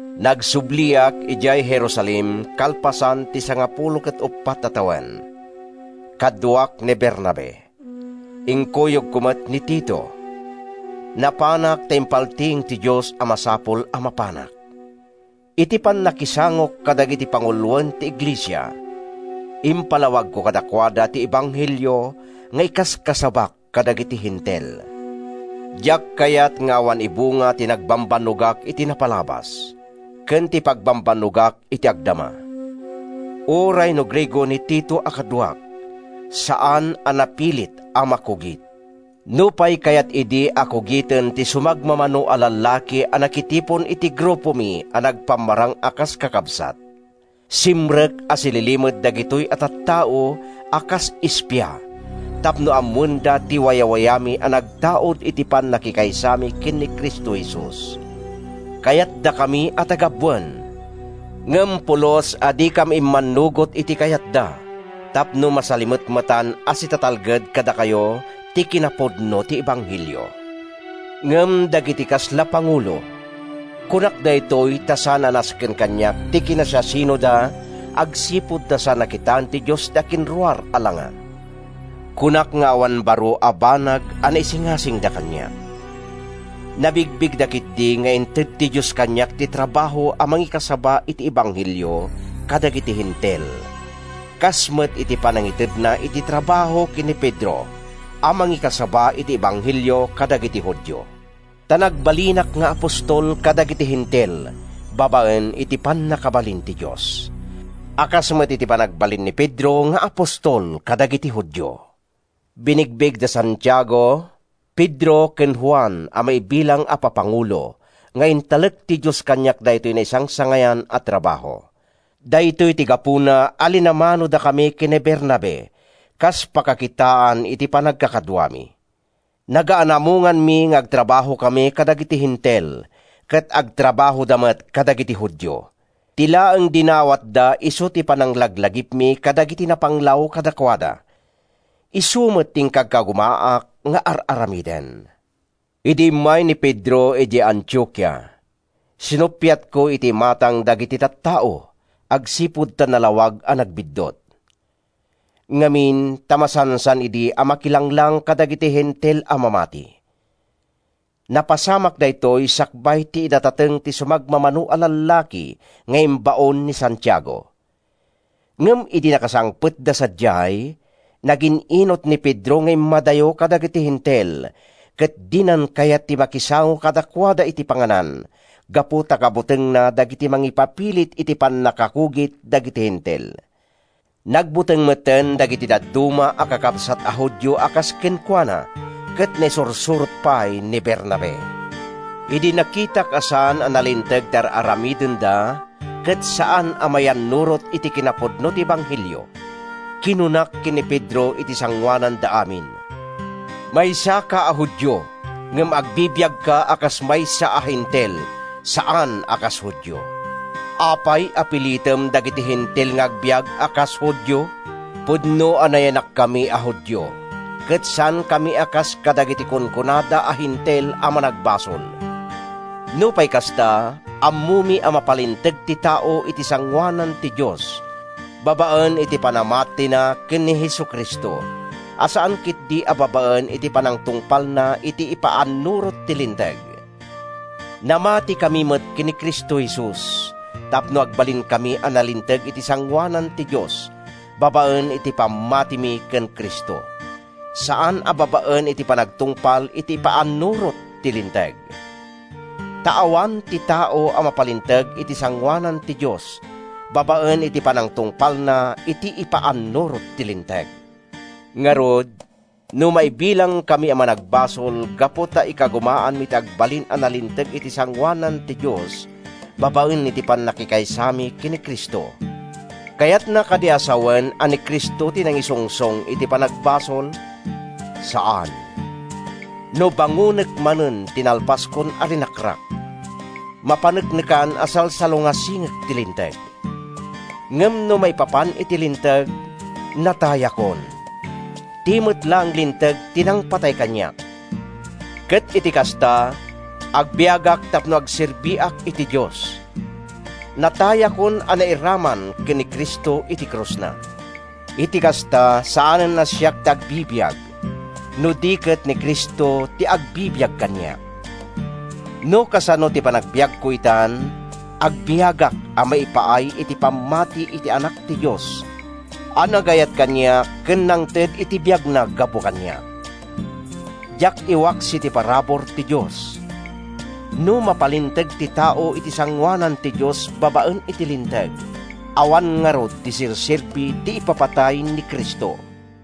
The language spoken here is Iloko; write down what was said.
Nagsubliak idiay Jerusalem kalpasan ti sangapulo ket uppat a tawen. Kaduak ni Bernabe. Inkuyogko met ni Tito. Napanak ta impaltiing ti Dios a masapul a mapanak. Iti pannakisangok kadagiti panguloen ti iglesia, impalawagko kadakuada ti ebanghelio nga ikaskasabak kadagiti Hentil. Diak kayat nga awan ibunga ti nagbambannogak iti napalabas ken ti pagbambannogak iti agdama. Uray no Griego ni Tito a kaduak, saan a napilit a makugit, nupay kayat idi a kugiten ti sumagmamano a lallaki a nakitipon iti grupomi a nagpammarang a kas kakabsat. Simrek a sililimed dagitoy a tattao a kas espia tapno ammoenda ti wayawayami a nagtaud iti pannakikaysami ken ni Cristo Jesus. Kayatdakami a tagabuen, ngem pulos a dikam immannugot iti kayatda tapno masalimetmetan a sitatalged kadakayo ti kinapudno ti ebanghelio. Ngem dagiti kasla pangulo—kunak daytoy ta saan a nasken kaniak ti kinasiasinoda agsipud ta saan a kitaen ti Dios ti akinruar a langa—kunak nga awan baro a banag a naisingasingda kaniak. Nabigbigda ketdi nga inted ti Dios kaniak ti trabaho a mangikasaba iti ebanghelio kadagiti Hentil, kas met iti panangitedna iti trabaho ken ni Pedro a mangikasaba iti ebanghelio kadagiti Judio. Ta nagbalinak nga apostol kadagiti Hentil babaen iti pannakabalin ti Dios, a kas met iti panagbalin ni Pedro nga apostol kadagiti Judio. Binigbig da Santiago, Pedro ken Juan a maibilang a papangulo nga intalek ti Dios kaniak daytoy naisangsangayan a trabaho. Daytoy ti gapuna a linamanodakami ken ni Bernabe kas pakakitaan iti panagkakaduami. Nagaanamonganmi nga agtrabahokami kadagiti Hentil ket agtrabahoda met kadagiti Judio. Ti laeng dinawatda isu ti pananglaglagipmi kadagiti napanglaw kadakuada. Isu met ti inkagkagumaak nga ar-aramiden. Idi immay ni Pedro idiay Antiokia, sinuppiatko iti imatang dagiti tattao agsipud ta nalawag a nagbiddut. Ngamin ta masansan idi a makilanglang kadagiti Hentil a mamati. Napasamak daytoy sakbay ti idadateng ti sumagmamano a lallaki nga imbaon ni Santiago. Ngem idi nakasangpetda sadiay, nagin-inut ni Pedro nga immadayo kadagiti Hentil ket dinan kayat ti makisango kadakuada iti panganan gapu ta kabutengna dagiti mangipapilit iti pannakakugit dagiti Hentil. Nagbuteng metten dagiti dadduma a kakabsat a Judio a kas kenkuana ket naisursurot pay ni Bernabe. Idi nakitak a saan a nalinteg ti ar-aramidenda ket saan a mayannurot iti kinapudno ti ebanghelio, kinunak ken ni Pedro iti sangoananda amin: “Maysaka a Judio, ngem agbibiagka a kas maysa a Hentil, saan a kas Judio. Apay a pilitem dagiti Hentil nga agbiag a kas Judio?” Pudno a nayanakkami a Judio, ket saankami a kas kadagiti kunkunada a Hentil a managbasol. Nupay kasta, ammomi a mapalinteg ti tao iti sangoanan ti Dios babaen iti panamatina ken ni Jesu-Cristo, a saan ketdi a babaen iti panangtungpalna iti ipaannurot ti Linteg. Namatikami met ken ni Cristo Jesus tapno agbalinkami a nalinteg iti sangoanan ti Dios babaen iti pammatimi ken Cristo, saan a babaen iti panagtungpal iti ipaannurot ti Linteg. Ta awan ti tao a mapalinteg iti sangoanan ti Dios babaen iti panangtungpalna iti ipaannurot ti Linteg. Ngarud, no maibilangkami a managbasol gapu ta ikagumaanmi ti agbalin a nalinteg iti sangoanan ti Dios babaen iti pannakikaysami ken ni Cristo, kayatna kadi a sawen a ni Cristo ti nangisungsong iti panagbasol? Saan! No bangonek manen ti nalpaskon a rinakrak, mapaneknekan a salsalungasingek ti Linteg. Ngem no maipapan iti Linteg, natayakon—ti met laeng Linteg ti nangpatay kaniak—ket iti kasta, agbiagak tapno agserbiak iti Dios. Natayakon a nairaman ken ni Cristo iti krusna. Iti kasta, saanen a siak ti agbibiag, no di ket ni Cristo ti agbibiag kaniak. No kasano ti panagbiagko itan, agbiagak a maipaay iti pammati iti Anak ti Dios a nagayat kaniak ken nangted iti biagna gapu kaniak. Diak iwaksi ti parabur ti Dios. No mapalinteg ti tao iti sangoanan ti Dios babaen iti Linteg, awan ngarud ti serserbi ti ipapatay ni Cristo.